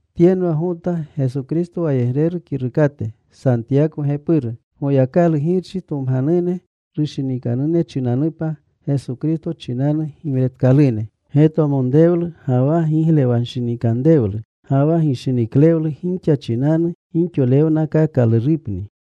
Tyenwa Gota Geso Kristo wayegreru kirukate, Santiyako gepuru. Goyakalu Girchi tomganune, rushinikanune chinanupa, Geso Kristo chinanu gimretkalune. Getwamonrewlu ga wa giglewanshinikanrewlu ga wa gishiniklewlu gixa chinanu gixolewnakaakalurupni.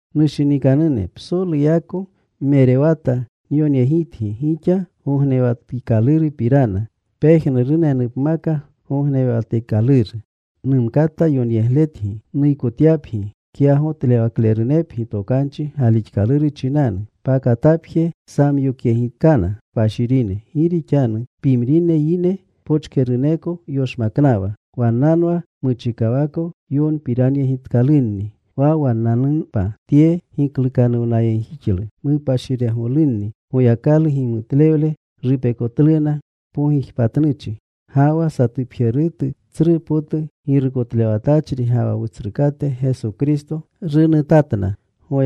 Nushinikanune, psoluyako nmerewata nyonyegitgi gixa gognewatikalurupirana, pejnurunenupmaka gognewatikaluru. Numkata yonyegletgi nuykotyapgi kyagotlewaklerunepgi tokanchi galixkaluru chinanu, pakatapje samyokyegitkana kpashirine. Gi rixanu pimrine yine pochkeruneko yoshmaknawa. Wannanwa muchikawako yonpiranyegitkalunni wa wannanupa tye giklukanuwnayegjixlu. Mupashiregolunni. Goyakalu gimutlewle rupekotluna mpogijpatnuchi. Ga wa satupjerutu tsru potu Girukotlewatachri ga wa Wutsrukate Geso Kristo runutatna.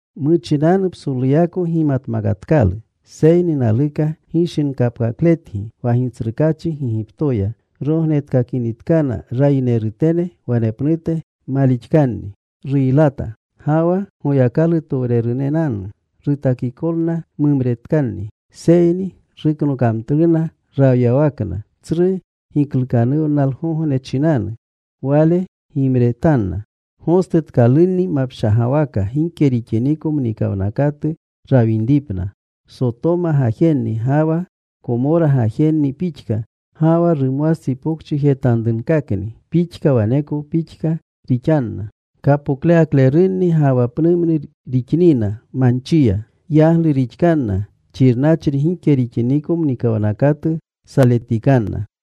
Muchinanu psoluyako gimatmakatkalu, seyni naluka gishinkapkakletgi, wa Gitsrukaachi Gigiptoya rognetkakinitkana rayinerutene, wanepnute malixkanni ruylata. Ga wa Goyakalutowrenenanu rutakikolna mumretkanni, seyni ruknokamtluna rawyawakna, tsru giklukanuwnalgogne chinanu Wale gimretanna gostutkalunni mapshagawaka gike rixiniko mnikawnakatu rawinripna. Sotoma gajenni ga wa Komora gajenni pixka ga wa rumwastsipokchijetanrukakni pixka waneko pixka rixanna kapoklewaklerunni, ga wa pnumnu rixnina manchiya. Yaglu rixkanna xirnachri gike rixiniko muwnakatu saletikanna.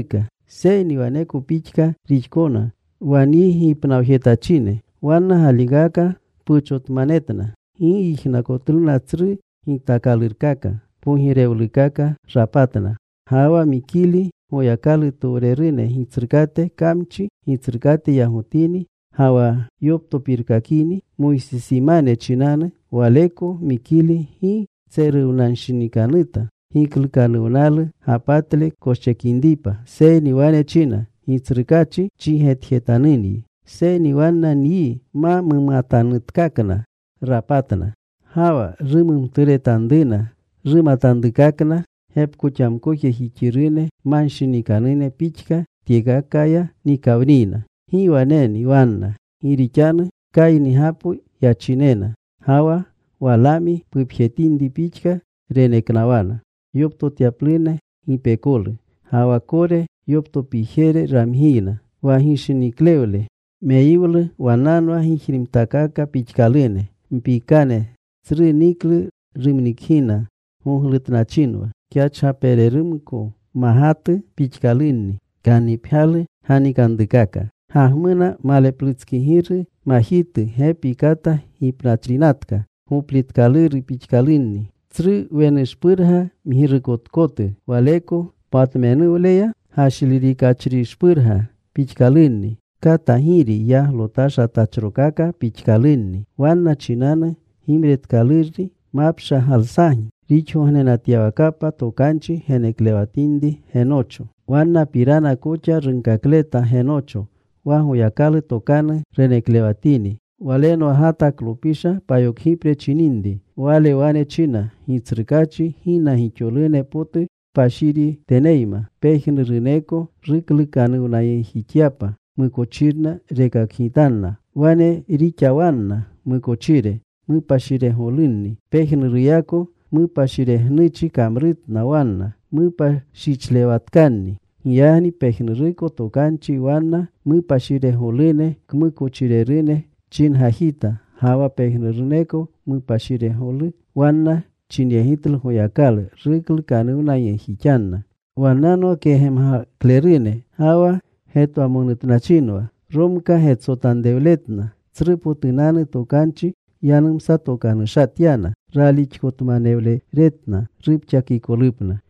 Seyni waneko pixka rixkoxna wa nyi gipnawjetachine. Wanna galikaka puchotmanetna. Gi yijnakotluna tsru gitaakalurkaka. Pogirewlukaka rapatna. Ga wa Mikili, Goyakalutowrerune gitsrukate, kamchi gitsrukate yagotini ga wa yoptopirkakini Moysisimane chinanu, waleko Mikili gi tseruwanshinikanuta giklukanuwnalu gapatle koschekinripa, seyni wane china, “Gitsrukaachi chigetjetanunyi.” Seyni wanna nyi ma mumatanutkakna rapatna. Ga wa rumumturetanruna rumatanrukakna gepkoxamkojejixirune manshinikanune pixka, tyekakaya nikawniyna. ¡Gi waneni wanna! Gi rixanu Kaynigapo yachinena. Ga wa Walaami pupjetinri pixka, reneknawana yoptotyapluna gipekolu. Ga wa Kore yoptopiire ramgiyna. Wa gishiniikaklewle meyiwlu wannanwa gijrimtakaka pixkalune. Mpiikane tsru niklu rumnikgina. Goglutnachinwa. Kyachgapererumko magatu pixkalunni, kannipgyalu ganikanrukaka. Gagmuna maleplutskigiru, majitu, gepi kata gipnachrinatka, gopliikaluru pixkalunni. Tsru wenushpurga mgirukotkotu, waleko patmenuwleya gashlirikachrishpurga pixkalunni. Katagiri yaglotashatachrokaka pixkalunni. Wanna chinanu gimretkalurni mapshagalsajnu rixgognenatyawakapa. Tokanchi reneklewatinri Genocho Wannapirana koxa runkakleta Genocho, wa Goyakalu tokanu reneklewatini. Walenwa Gataklopisha payokgipre chininri. Wale wane china, “Gitsrukaachi gina gixolune potu kpashiriteneyma, pejnuruneko ruklukanuwnayegjixyapa. Mukochirna rekakgitanna. Wane rixawanna mukochire: Mupashiregolunni. Pejnuruyako mupashiregnuchi kamrutna wanna. Mupashichlewatkanni. Giyagni pejnuruko tokanchi wanna mupashiregolune kmukochirerune chingajita ga wa pejnuruko mupashiregolu wanna chinyegitlu Goyakalu, ruklukanuwnayegjixanna.” Wannanwa kegemgaklerune ga wa getwamonutnachinwa. Romkaa getsotanrewletna. Tsrupotunanu tokanchi yanumsatokanushatyana. Ralixkotmanewlerewatna rupxakikolupna.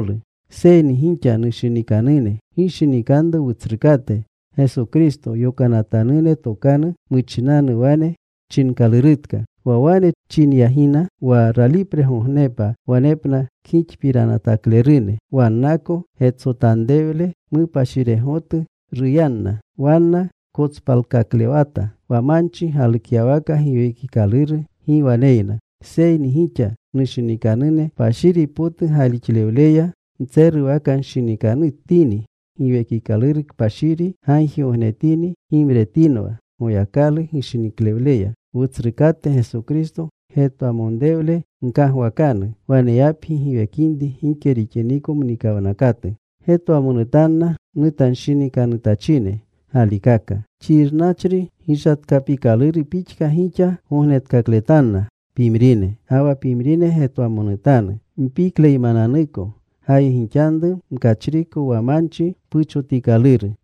Seyni gixa, nushinikanune, gishinikanru Wutsrukate Geso Kristo yokanatanune tokanu muchinanu wane chinkalurutka. Wa wane chinyagina, “Wa ralipregognepa wanepna kgixpiranataklerune. Wannako getsotanrewle mupashiregotu ruyanna.” Wanna kotspalkaklewata wa manchi galukyawaka. Giwekikaluru gi waneyna. Seyni gixa, nushinikanune, kpashiri potu galixlewleya ntseruwnanshinikanutini. Giwekikaluru Kpashiri gagjigognetini. Gimretinwa Goyakalu gishiniklewleya. Wutsrukate Geso Kristo getwamonrewle gkagwakanu waneyapgi giwekinri gike rixiniko mnikawnakatu. Getwamonutanna nutanshinikanutachine galikaka. Xirnachri gishatkapikaluru pixka gixa gognetkakletanna pimrine. Ga wa pimrine getwamonutanu mpikleymananuko. Gayegixanru mkachriko wa manchi puchotikaluru.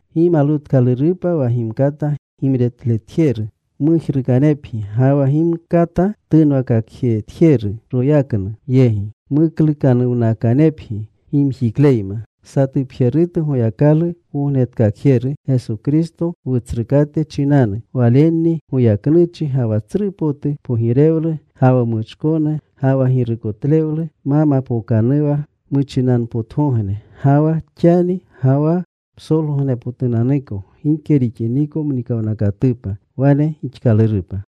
Gimalwutkalurupa wa gimkata gimretletjeru mujruukanepgi ga wa gimkata tunwakakletjeru royaknu yegi, muklukanuwnakanepgi gimjikleyma. Satupjerutu Goyakalu Wognetkakjeru, Geso Kristo Wutsrukate chinanu, walenni goyaknuchi, ga wa tsru potu pogirewlu, ga wa muchkonu, ga wa girukotlewlu ma mapookanuwa muchinanpotgogne, ga wa xani, ga wa psolgogneshpotunanuko gike rixiniko mnikanwnakatupa. Wane gixkalurupa.